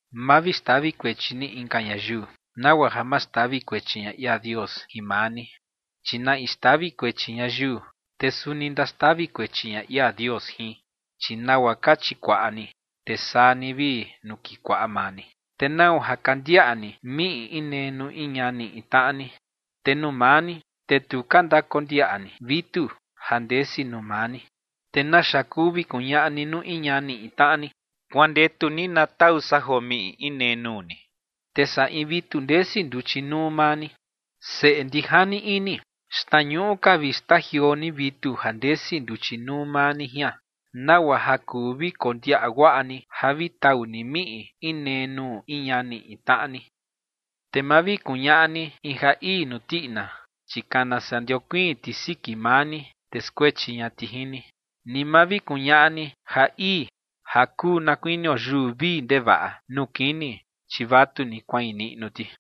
’Ma vi xtavi kuechi ni inka ñayiu, nagua ja ma xtavi kuechi ña ia Dios jin maa ni. Chi na in xtavi kuechi ñayiu, te suni ndaxtavi kuechi ña ia Dios jin. Chi nagua ka chikuaꞌa ni, te saa ni vi nukikuaꞌa maa ni. ¿Te nau ja ka ndiaꞌa ni miꞌi inee nuu in ñani in tnaꞌa ni, te nuu maa ni, te tu ka ndakondiaꞌa ni vitu ja ndesi nuu maa ni? ¿Te naxa kuu vi kuñaꞌa ni nuu in ñani in tnaꞌa ni: “Kuandetu ni na tau san joo miꞌi inee nuu ni”, te saa in vitu ndesi nduchi nuu maa ni? Seꞌe ndijani ini, xtnañuꞌu ka vi xtajioo ni vitu ja ndesi nduchi nuu maa ni jian, nagua ja kuu vi kondiaꞌa guaꞌa ni ja vi tau ni miꞌi inee nuu in ñani in tnaꞌa ni. ’Te ma vi kuñaꞌa ni in ja ii nuu tiꞌina, chi kana saa ndiokuiin ti siki maa ni, te skuechi ña ti jin ni. Ni ma vi kuñaꞌa ni ja ii ja kuu na kuinio yuu vii ndevaꞌa nuu kini, chi vatuni kuain niꞌnu ti.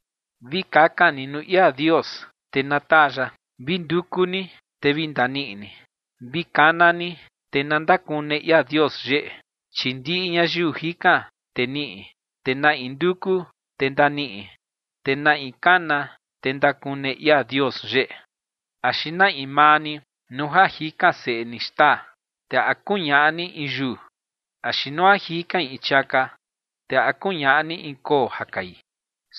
’Vi kakan ni nuu ia Dios, te na taa ya. Vi nduku ni, te vi ndaniꞌi ni. Vi kana ni, te na ndakune ia Dios yeꞌe. Chi ndiꞌi ñayiu jikan, te niꞌi. Te na in nduku, te ndaniꞌi. Te na in kana, te ndakune ia Dios yeꞌe. ’Axi na in maa ni nuu ja jikan seꞌe ni xtaa, te ¿a kuñaꞌa ni in yuu? Axi nuu ja jikain in chiaka, te ¿a kuñaꞌa ni in koo ja kai?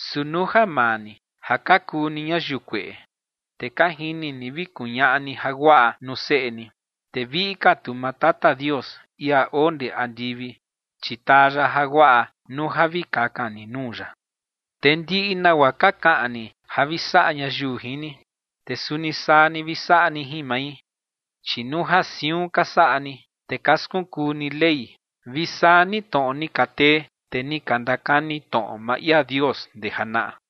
Su nuu ja maa ni ja ka kuu ni ñayiu kueꞌe, te ka jini ni vi kuñaꞌa ni jaguaꞌa nuu seꞌe ni, te viꞌi ka tu maa Tata Dios, ia oo ndee andivi, chi taa ya jaguaꞌa nuu ja vi kakan ni nuu ya. ’Te ndiꞌi nagua ka kaꞌan ni ja vi saꞌa ñayiu jin ni, te suni saa ni vi saꞌa ni jin mai, chi nuu ja siun ka saꞌa ni, te ka skunkuu ni Ley vi saa ni tnoꞌo ni ka tee tee ni ka ndakani tnoꞌo maa ia Dios ndee janaꞌa.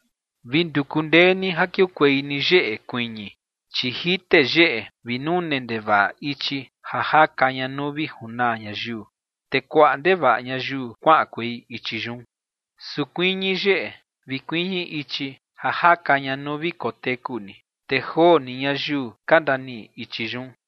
’Vi nduku ndee ni ja kiukuei ni yeꞌe kuiñi, chi jite yeꞌe vi nune ndevaꞌa ichi ja jaka ña nuu vi junaa ñayiu, te kuaꞌa ndevaꞌa ñayiu kuaꞌankuei ichi yun. Su kuiñi yeꞌe vi kuiñi ichi ja jaka ña nuu vi koteku ni, te joo ni ñayiu ka ndaniꞌi ichi yun.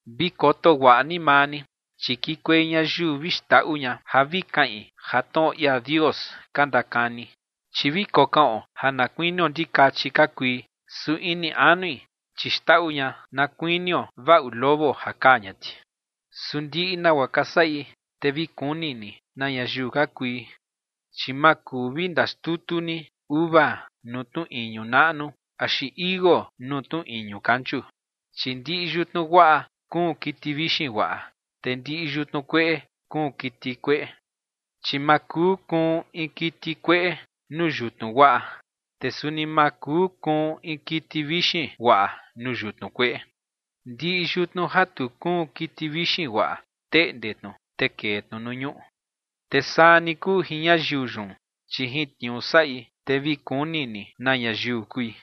’Vi koto guaꞌa ni maa ni, chi kikuei ñayiu vi xndaꞌu ña ja vi kaꞌin ja tnoꞌo ia Dios ka ndakani. Chi vi kokaꞌon ja na kuinio ndikachi ka kui, su ini anui, chi xndaꞌu ña na kuinio vaꞌu lobo ja kaa ña ti. Su ndiꞌi nagua ka saꞌi, te vi kuni ni na ñayiu ka kui. Chi ma kuu vi ndaxtutu ni uva nuu tnu iñu naꞌnu, axi tichi iuu nuu tnu iñu kanchu. Chi ndiꞌi yutnu guaꞌa kuun kiti vixin guaꞌa, te ndiꞌi yutnu kueꞌe kuun kiti kueꞌe. Chi ma kuu kuun in kiti kueꞌe nuu yutnu guaꞌa, te suni ma kuu kuun in kiti vixin guaꞌa nuu yutnu kueꞌe. Ndiꞌi yutnu ja tu kuun kiti vixin guaꞌa, teꞌnde tnu, te kee tnu nuu ñuꞌu. Te saa ni kuu jin ñayiu yun, chi jin tniuu saꞌi, te vi kuni ni na ñayiu kui.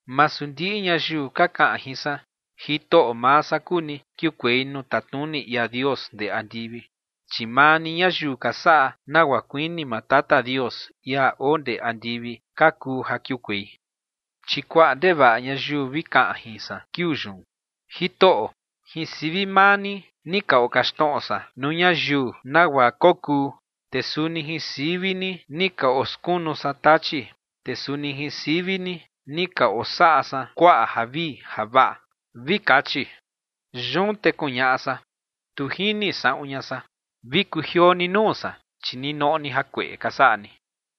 ’Masu ndiꞌi ñayiu ka kaꞌan jin san: “Jitoꞌo maa san kuu ni”, kiukuei nuu tatnuni ia Dios ndee andivi, chi maa ni ñayiu ka saꞌa nagua kuini maa Tata Dios, ia oo ndee andivi, ka kuu ja kiukuei. Chi kuaꞌa ndevaꞌa ñayiu vi kaꞌan jin san kiuu yun: “Jitoꞌo, jin sivi maa ni ni ka okaxtnoꞌo san nuu ñayiu nagua kokuu, te suni jin sivi ni ni ka oskunu san tachi, te suni jin sivi ni ni ka osaꞌa san kuaꞌa javii javaꞌa”, vi kachi. Yun te kuñaꞌa san: “Tu jini saꞌun ña san. Vi kujioo ni nuu san, chi ni noꞌo ni jakueꞌe ka saꞌa ni.”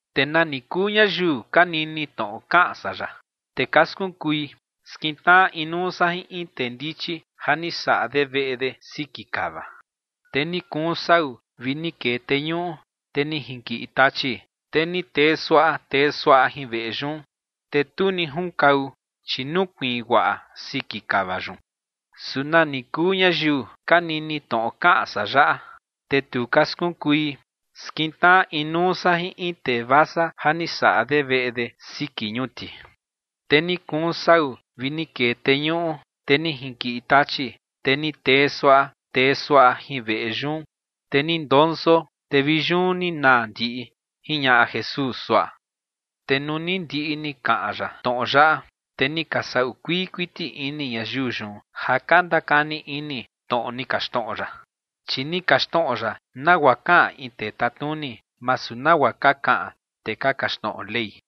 ’Te nani kuu ñayiu ka nini tnoꞌo kaꞌan san yaꞌa, te ka skunkui, skintnaꞌa inuu san jin in tee ndichi ja ni saꞌa de veꞌe de siki kava. Te ni kuun sau vi ni kee teñuꞌu, te ni jinkiꞌi tachi, te ni tee suaꞌa tee suaꞌa jin veꞌe yun, te tu ni junkau, chi nukuiin guaꞌa siki kava yun. Su nani kuu ñayiu ka nini tnoꞌo kaꞌan san yaꞌa, te tu ka skunkui, skintnaꞌa inuu san jin in tee vasa ja ni saꞌa de veꞌe de siki ñuti. Te ni kuun sau vi ni kee teñuꞌu, te ni jinkiꞌi tachi, te ni tee suaꞌa tee suaꞌa jin veꞌe yun, te ni ndonso, te vi yun ni naa ndiꞌi ͏―͏jiñaꞌa Jesús suaꞌa. Te nuu ni ndiꞌi ni kaꞌan ya tnoꞌo yaꞌa, te ni ka saꞌu kuii kuiti ini ñayiu yun ja ka ndakani ini tnoꞌo ni kaxtnoꞌo ya. Chi ni kaxtnoꞌo ya nagua kaꞌan in tee tatnuni, masu nagua ka kaꞌan tee ka kaxtnoꞌo Ley.